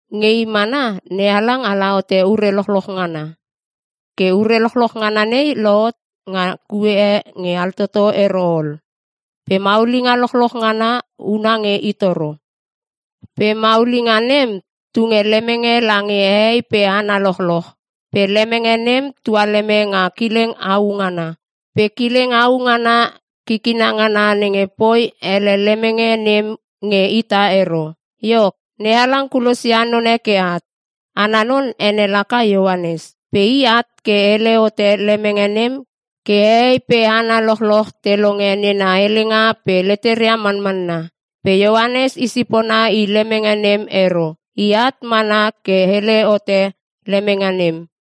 Nge i mana, NeHalang ala hote ure lochloch ngana. Ke ure lochloch ngana nei lohot nga kue e nge altoto ero ol. Pe maulinga lochloch ngana huna nge i toro. Pe maulinga nem, tunge lemenge lange hehei pe hana lochloch. Pe lemenge nem tualeme nga kileng au ngana. Pe kileng au ngana kikina ngana nenge poi hele lemenge nem nge ita ero. Iok, NeHalang kulosia none ke at. Ana non ene laka Ioanes. Pe i at ke hele hote Lemenge nem ke hehei pe hana lochloch te longe nena helenga pe leteria manmanna. Pe Ioanes i sipona i lemenge nem ero. I at mana ke hele hote lemenge nem.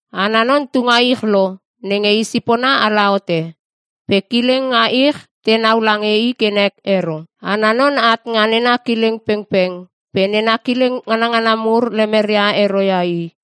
Ana non tu nga ich lo nenge i sipona ala hote. Pe kileng nga ich tenau lange i ke nek ero. Ana non at nga nena kileng pengpeng pe nena kileng nganangana mur lemeria ero ia i.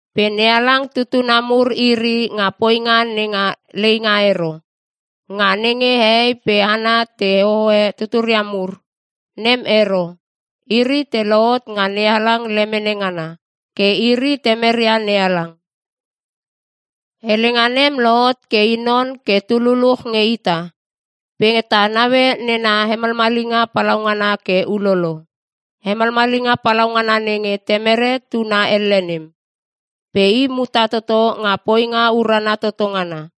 Pe NeHalang tutuna mur iri nga poinga nenga leinga ero, nga nenge hehei pe hana te hohoe tuturia mur. Nem ero. Iri te lohot nga NeHalang lemene ngana. Ke iri temeria NeHalang. Helenga nem lohot ke i non ke tu luluch nge ita. Pe ta naue nena hemalmalinga palaungana ke ulolo. Hemalmalinga palaungana nenge Temere Tuna elle nem. Pe i muta toto nga poinga urana toto ngana.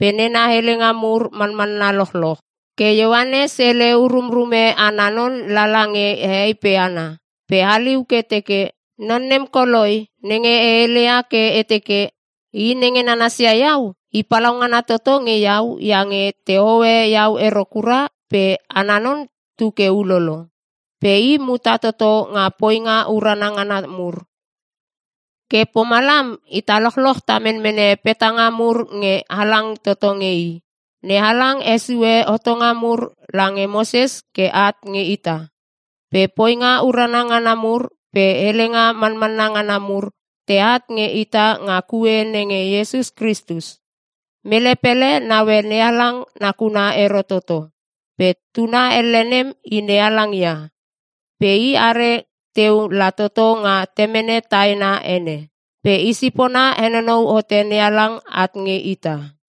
Pe nena helenga mur manmanna lochloch. Ke Ioanes hele urumrume ana non lala nge hehei pe hana, pe haliu ke teke, “Non nem koloi nenge e heleia ke e teke, ‘I nenge nanasia iau, i palaungana toto nge iau iange tehoe iau ero kura pe ana non tu ke ulolo.’” Pe i muta toto nga poinga urana ngana mur. Ke pomalam ita lochloch ta menmene petanga mur nge halang toto nge i. NeHalang hesue hotonga mur lange Moses ke at nge ita. Pe poinga urana ngana mur pe helenga manmanna ngana mur teat nge ita nga kue nenge Iesus Kristus. Mele pele naue NeHalang nakuna ero toto. Pe tuna elle nem i NeHalang ia. Pe i are teu la toto nga Temene taena ene. Pe i sipona henonou hote NeHalang at nge ita.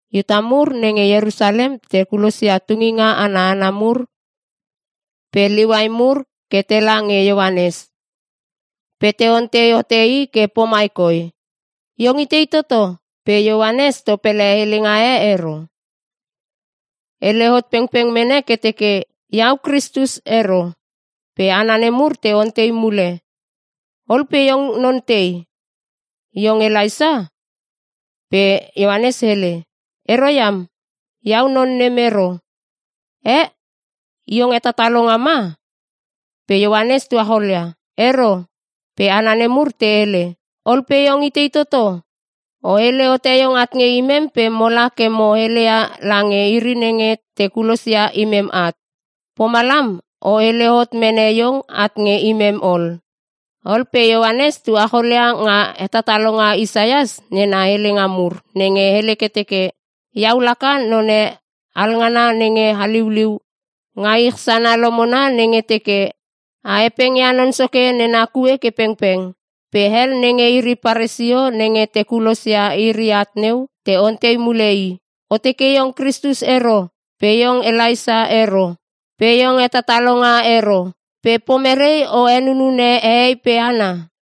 Iuta mur nenge Ierusalem te kulosia tunginga ana hana mur pe Liuai mur ke tela nge Ioanes pe te ontei hote i ke pomai koi, “Iong itei toto?” Pe Ioanes topele helenga e ero. Hele hot pengpeng mene ke teke, “Iau Kristus ero.” Pe hana nemur te ontei mule, “Ol pe iong non tei? Iong Elaisa?” Pe Ioanes hele, “Ero iam, iau non nem ero.” “Eh! Iong hetatalonga ma?” Pe Ioanes tucholia, “Ero.” Pe hana nemur te hele, “Ol pe iong itei toto? O hele hote iong at nge imem pe mola ke mo heleia lange iri nenge te kulosia imem at. Pomalam o hele hot mene iong at nge imem ol.” Ol pe Ioanes tuacholia nga hetatalonga Isaias nena helenga mur nenge hele ke teke, “Iau laka none alngana nenge haliuliu nga ich sana lomona nenge teke, ‘A hepeng ia Non Soke nena kue ke pengpeng.’” Pe hel nenge iri Paresio nenge te kulosia iri at neu, te ontei mule i, “O teke iong Kristus ero, pe iong Elaisa ero pe iong hetatalonga ero. Pe pomerei o henunune hehei pe hana?”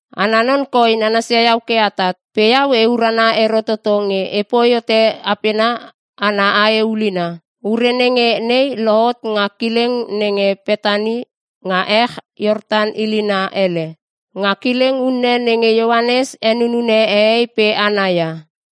Ana non koi nanasia iau ke atat. Pe iau e urana ero toto nge epoi hote apena ana ae ulina.” Ure nenge nei lohot nga kileng nenge Petani nga ech Iortan ilina hele. Nga kileng unne nenge Ioanes henunune hehei pe hana ia.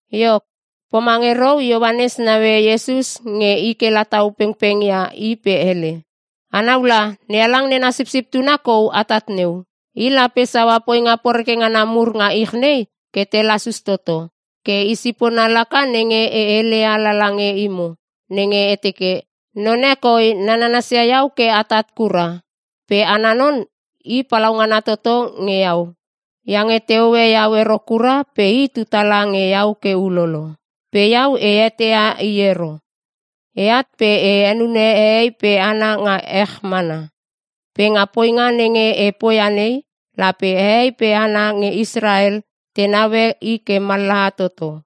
Iok, pomange rou Ioanes naue Iesus nge i ke la tau pengpeng ia i pe hele, “Anau la NeHalang nena Sipsip Tuna kou atat neu. I lape saua poinga poreke ngana mur nga ich nei ke te lasus toto. Ke i sipona laka nenge e heleia lala nge imo nenge e teke, ‘None koi nananas ia iau ke atat kura. Pe ana non i palaungana toto nge iau. Iange tehoe iau ero kura pe i tu tala nge iau ke ulolo.’ Pe iau e eteia i ero. Eat pe e henune hehei pe hana nga ech mana. Pe nga poinga nenge e poia nei, lape hehei pe hana nge Israel te naue i ke mallaha toto.”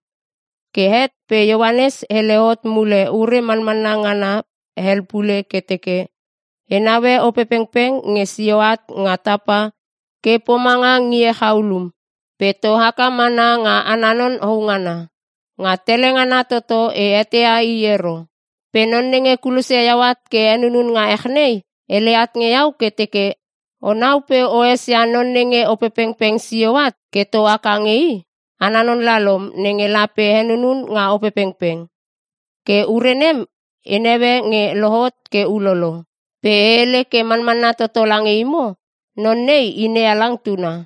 Ke het pe Ioanes hele hot mule ure manmanna ngana hel pule ke teke, “E naue Opepengpeng nge sio at nga tapa ke pomanga ngie chaulum, pe to haka mana nga ana non houngana. Nga tele ngana toto e eteia i ero. Pe Non nenge kulosia iau at ke e henunun nga ech nei, hele at nge iau ke teke, ‘Onau pe o esia non nenge Opepengpeng sio at ke to haka nge i, ana non lalom nenge lape henunun nga Opepengpeng.’ Ke ure nem e naue nge lohot ke ulolo. Pe e hele ke manmanna toto lange imo, Non nei i NeHalang tuna.”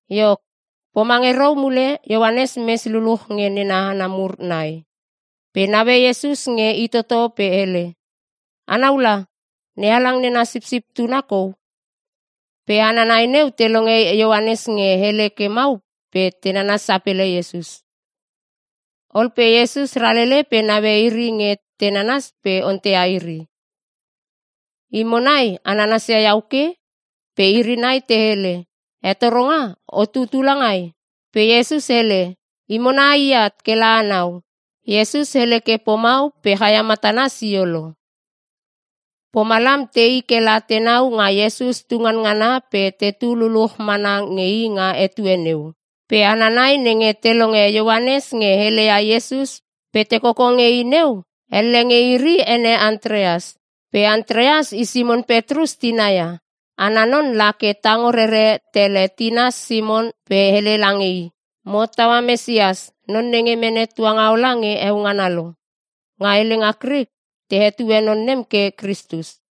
Iok, pomange rou mule Ioanes mes luluch nge nena hana mur nai. Pe naue Iesus nge i toto pe hele, “Anau la, NeHalang nena Sipsip Tuna kou!” Pe hana nai neu te longe Ioanes nge hele ke mau pe te nanas sapele Iesus. Ol pe Iesus ralele pe naue iri nge te nananas pe onteia iri, “Imo nai a nansia iau ke?” Pe iri nai te hele, “Hetoronga, o tutu langai?” Pe Iesus hele, “Imo nai aiat kela anau.” Iesus hele pomau pe chaia matana sisio lo. Pomalam tei kela tenau nga Iesus tu nganngana pe tetu luluch mana nge i nga etue neu. Pe hana nai nenge te longe Ioanes nge heleia Iesus pe te koko nge i neu, elle nge iri ene Antreas. Pe Antreas i Simon Petrus tina ia. Ana non la ke tango rere tele tina Simon pe hele lange i, “Mo hottaua Mesias, non nenge mene tuangaola nge heo ngana lo.” (Nga helenga Krik te hetue non nem ke “Kristus”.)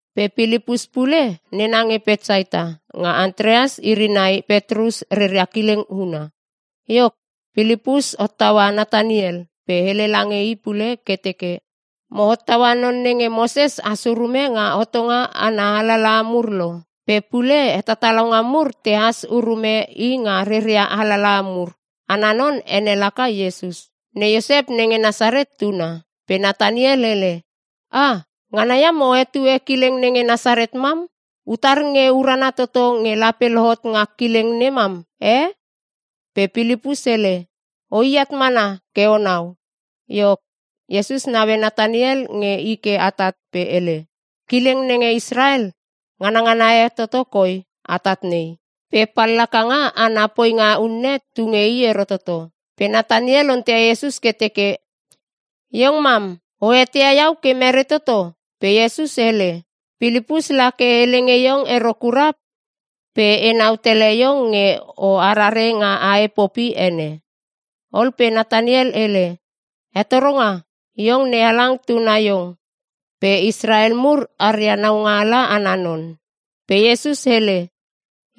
Pe Pilipus pule nena nge Petsaita nga Antreas iri nai Petrus reria kileng huna. Iok, Pilipus hottaua Nataniel pe hele lange i pule ke teke, “Mo hottaua non nenge Moses has urume nga hotonga ana alalaha mur lo. Pe pule hetatalonga mur tehas urume i nga reria alalaha mur. Ana non ene laka Iesus. Ne Iosep nenge Nasaret tuna.” Pe Nataniel hele, “Ah! Ngana iam o hetue kileng nenge Nasaret mam! Utar nge urana toto nge lape lohot nga kileng nem mam, eh!?” Pe Pilipus hele, “Oi at mana ke onau.” Iok, Iesus naue Nataniel nge i ke atat pe hele, “Kileng nenge Israel nganangana e toto koi atat nei. Pe pallakanga ana poinga unne tu nge i ero toto.” Pe Nataniel onteia Iesus ke teke, “Iong mam o eteia iau ke merei toto?” Pe Iesus hele, “Pilipus la ke hele nge iong ero kura pe enau tele iong nge o arare nga ae popi ene.” Ol pe Nataniel hele, “Hetoronga! Iong NeHalang Tuna Iong pe Israel mur aria Naungaala ana non!” Pe Iesus hele,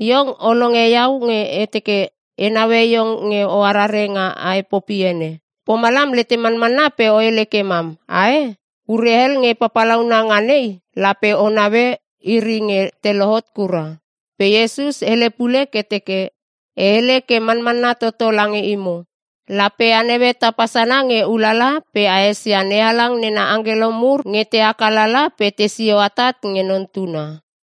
“Iong o longe iau nge e teke e naue iong nge o arare nga ae popi ene. Pomalam letem manmanna pe o hele ke mam, ae? Ure hel nge papalauna nga nei, lape o naue iri nge te lohot kura.” Pe Iesus hele pule ke teke, e hele ke manmanna toto lange imo: lape a naue tapa sana nge ulala pe a esia NeHalang nena angkelo mur nge te haka lala pe tesio atat nge Non Tuna.